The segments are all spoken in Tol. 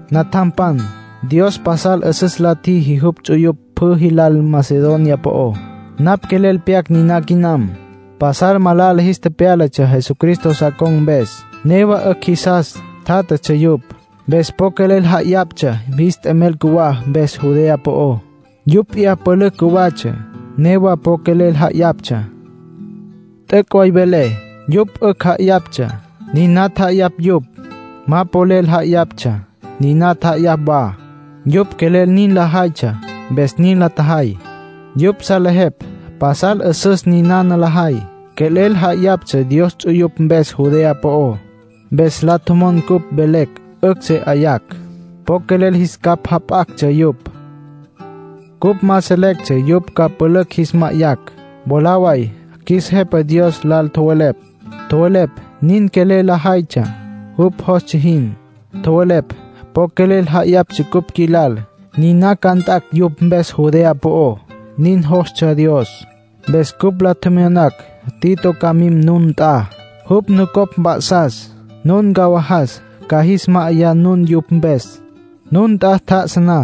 Natjampan, Dios pasal 'üsüs la tjiji jupj ts'uyupj pjü jilal Macedonia po'ó. Napj quelel pyac niná quinam. Pasal malala jis tepyálatsja Jesucristo sa con̈ mpes, newa 'ücj jisas tjátjatsja yupj. Mpes po quelel ja'ayaptsja jis t'emel cjuwá mpes Judea po'ó. Yupj p'iyá pülücj cjuwatsja, newa po quelel ja'ayaptsja. T'üc' way velé. Yupj 'ücj ja'ayaptsja, niná tja'ayapj yupj. Ma polel ja'ayaptsja, niná tja'ayapj wa. Yupj quelel nin lajaytsja, mpes nin la tjajay. Yupj salejepj pasal 'üsüs ninana lajay. Quelel ja'ayaptsja Dios ts'uyupj mpes Judea po'ó. Mpes la tjomon cupj mvelecj 'ücj se 'ayapj. Po quelel jis capj jap'actsja yupj. Cupj ma selectsja yupj ca pülücj jis ma'ayacj. Mwalá way qjuis Jepa Dios lal tjowelepj, tjowelepj nin quelel lajaytsja jupj jostsja jin. Tjowelepj po quelel ja'ayaptsja cupj qjuilal, niná ca nt'acj yupj mpes Judea po'ó. Nin jostsja Dios. Mpes cupj la tjemyonacj Tito ca mim nun nt'a. Jupj nucopj mp'a'sas, nun ncawajas ca jis ma'ayá nun yupj mpes. Nun nt'a tjá'asa na,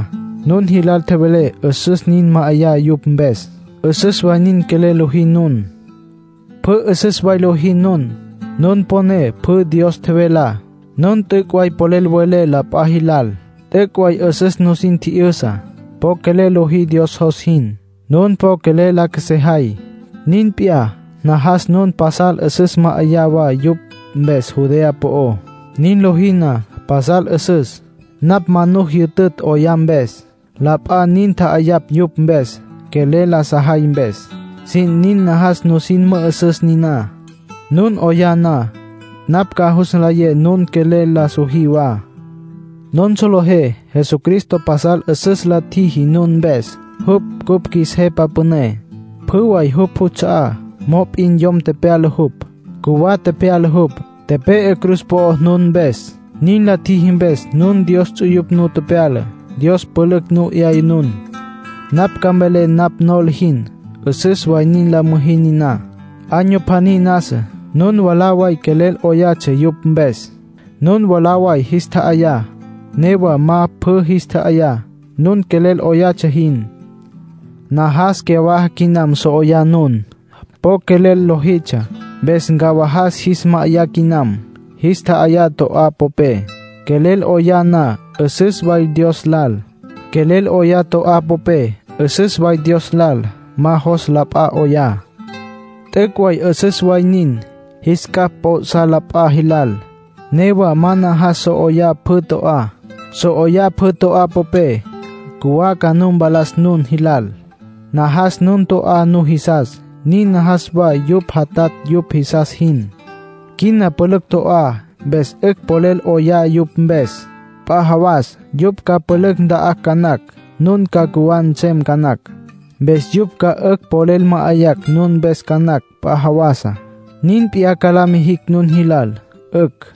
nun jilal tjevele 'üsüs nin ma'ayá yupj mpes. 'Üsüs way nin quelel lojí nun. Pjü 'üsüs way lojí nun. Nun poné pjü Dios tjevelá. Nun t'üc' way polel welé la p'a jilal. T'üc' way 'üsüs nusin tji'yüsa. Po quelel lojí Dios jos jin. Nun po quelel la qjuesejay. Nin p'iyá, najas nun pasal 'üsüs ma'ayá wa yupj mpes Judea po'ó. Nin lojí na, pasal 'üsüs. Napj ma nu jyütütj 'oyá mpes. La p'a nin tja'ayapj yupj mpes, quelel la sajay mpes. Sin nin najas nusin mü'üsüs niná. Nun 'oyá na, napj ca jus nlayé nun quelel la sojí wa. Nun solejé Jesucristo pasal 'üsüs la tjiji nun mpes, jupj cupj qjuis Jepa Püné. Pjü way jupj juts'a'á, mop'in yom tepyala jupj. Cjuwá tepyala jupj, tepe'e cruz po'ó nun mpes. Nin la tjiji mpes nun Dios ts'uyupj nu tepyala, Dios pülücj nu 'yaya nun. Napj ca mvelé napj nola jin. 'Üsüs way nin la müjí niná. Año pjaní nasa, nun mwalá way quelel 'oyatsja yupj mpes. Nun mwalá way jis tja'ayá, newa ma pjü jis tja'ayá, nun quelel 'oyatsja jin. Najas cyawaja quinam, so 'oyá nun. Po quelel lojitsja. Mpes ncawajas jis ma'ayá quinam. Jis tja'ayá to'á popé. Quelel 'oyá na, 'üsüs way Dios lal. Quelel 'oyá to'á popé, 'üsüs way Dios lal. Ma jos la p'a 'oyá. T'üc' way 'üsüs way nin, jis capj p'o'sá la p'a jilal. Newa ma najas so 'oyá pjü to'á. So 'oyá pjü to'á popé, cjuwá ca nu mpalas nun jilal. Najas nun to'á nujisas, nin najas wa yupj jatatj yupj jisas jin. Quina pülücj to'á, mpes 'ücj polel 'oyá yupj mpes. P'a jawas yupj ca pülücj nta'acj ca nacj, nun ca cjuwá nsem ca nacj. Mpes yupj ca 'ücj polel ma'ayacj nun mpes ca nacj p'a jawasá. Nin p'iyá ca la mijicj nun jilal. 'Ücj.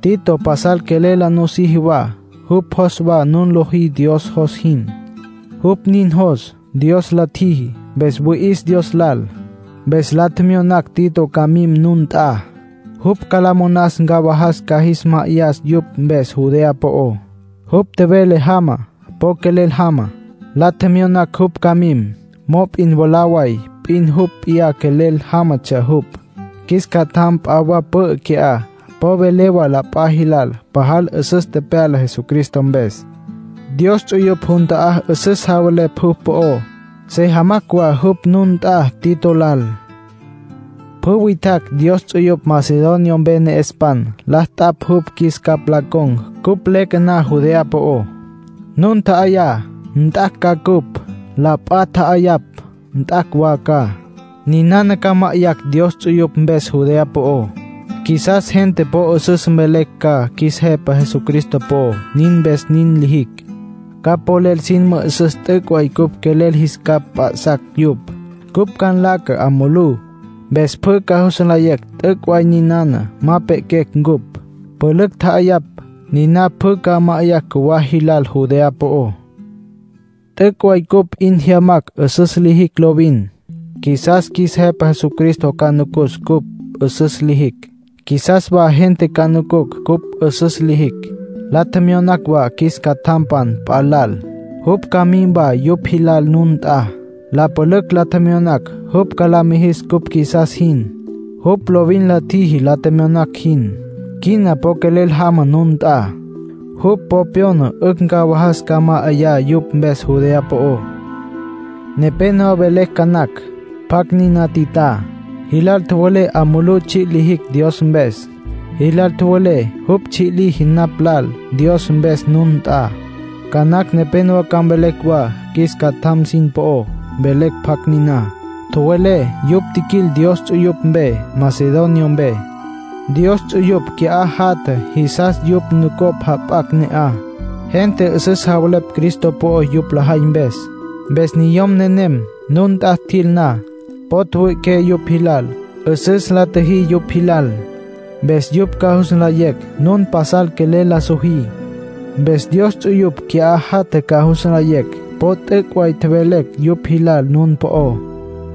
Tito pasal quelel la nusiji wa, jupj jos wa nun lojí Dios jos jin. Jupj nin jos Dios la tjiji. Mpes wüi'is Dios lal. Mpes la tjemyonacj Tito ca mim nun nt'a. Jupj ca la monas ncawajas ca jis ma'ayá yupj mpes Judea po'ó. Jupj tjevele jama. Po quelel jama. La tjemyonacj jupj ca mim; mop'in mwalá way p'in jupj p'iyá quelel jámatsja jupj. Qjuis catjam p'a wa pü'ü qui'á po vele wa la p'a jilal pajal 'üsüs tepyala Jesucristo mpes. Dios ts'uyupj jun ta'á 'üsüs javelepj jupj po'ó. Se jamacj wa jupj nun nt'a Tito lal. Pjü witjacj Dios ts'uyupj Macedonia mpe ne'espan la t'apj jupj qjuis capj la con̈ cupj leque na Judea po'ó. Nun tja'ayá, nt'acj ca cupj. La p'a tja'ayapj, nt'acj wa ca. Ninana ca ma'ayacj Dios ts'uyupj mpes Judea po'ó. Qjuisas gente po 'üsüs mvelecj ca qjuis Jepa Jesucristo po'ó, nin mpes nin lijicj. Ca polel sin mü'üsüs t'üc' way cupj quelel jis capj mp'a'sacj yupj. Cupj ca nlaca 'a mulú, mpes pjü ca jus nlayecj t'üc' way ninana ma pe'quecj ncupj. Pülücj tja'ayapj, niná pjü ca ma'ayacj cjuwá jilal Judea po'ó. T'üc' way cupj 'in jyamacj 'üsüs lijicj lovin. Qjuisas qjuis Jepa Jesucristo ca nucus cupj 'üsüs lijicj; qjuisas wa gente ca nucucj cupj 'üsüs lijicj. La tjemyonacj wa qjuis catjam p'a lal, jupj ca mim wa yupj jilal nun nt'a. La pülücj la tjemyonacj jupj la mijis cupj qjuisas jin. Jupj lovin la tjiji la tjemyonacj jin. Quina po quelel jama nun nt'a. Jupj po pyona 'ücj ncawajas ca ma'ayá yupj mpes Judea po'ó. Nepénowa mvelecj ca nacj, pjacj niná Titá. Jilal tjowelé 'a mulú tsji' lijicj Dios mpes. Jilal tjowelé jupj tsji' liji napj lal Dios mpes nun nt'a. Ca nacj nepénowa ca mvelecj wa qjuis catjampan sin po'ó, mvelecj pjacj niná. Tjowelé yupj tjiquil Dios ts'uyupj mpe Macedonia mpe; Dios ts'uyupj qui'á jatja jisas yupj nucopj jap'acj ne'aj. Gente 'üsüs javelepj Cristo po'ó yupj lajay mpes. Mpes niyom nenem nun nt'a tjil na, po tjüwüi'iqué yupj jilal, 'üsüs la tjüjí yupj jilal. Mpes yupj ca jus nlayecj nun pasal quelel la sojí. Mpes Dios ts'uyupj qui'á jatja ca jus nlayecj po t'üc' way tjevelecj yupj jilal nun po'ó.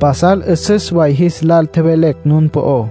Pasal 'üsüs way jis lal tjevelecj nun po'ó.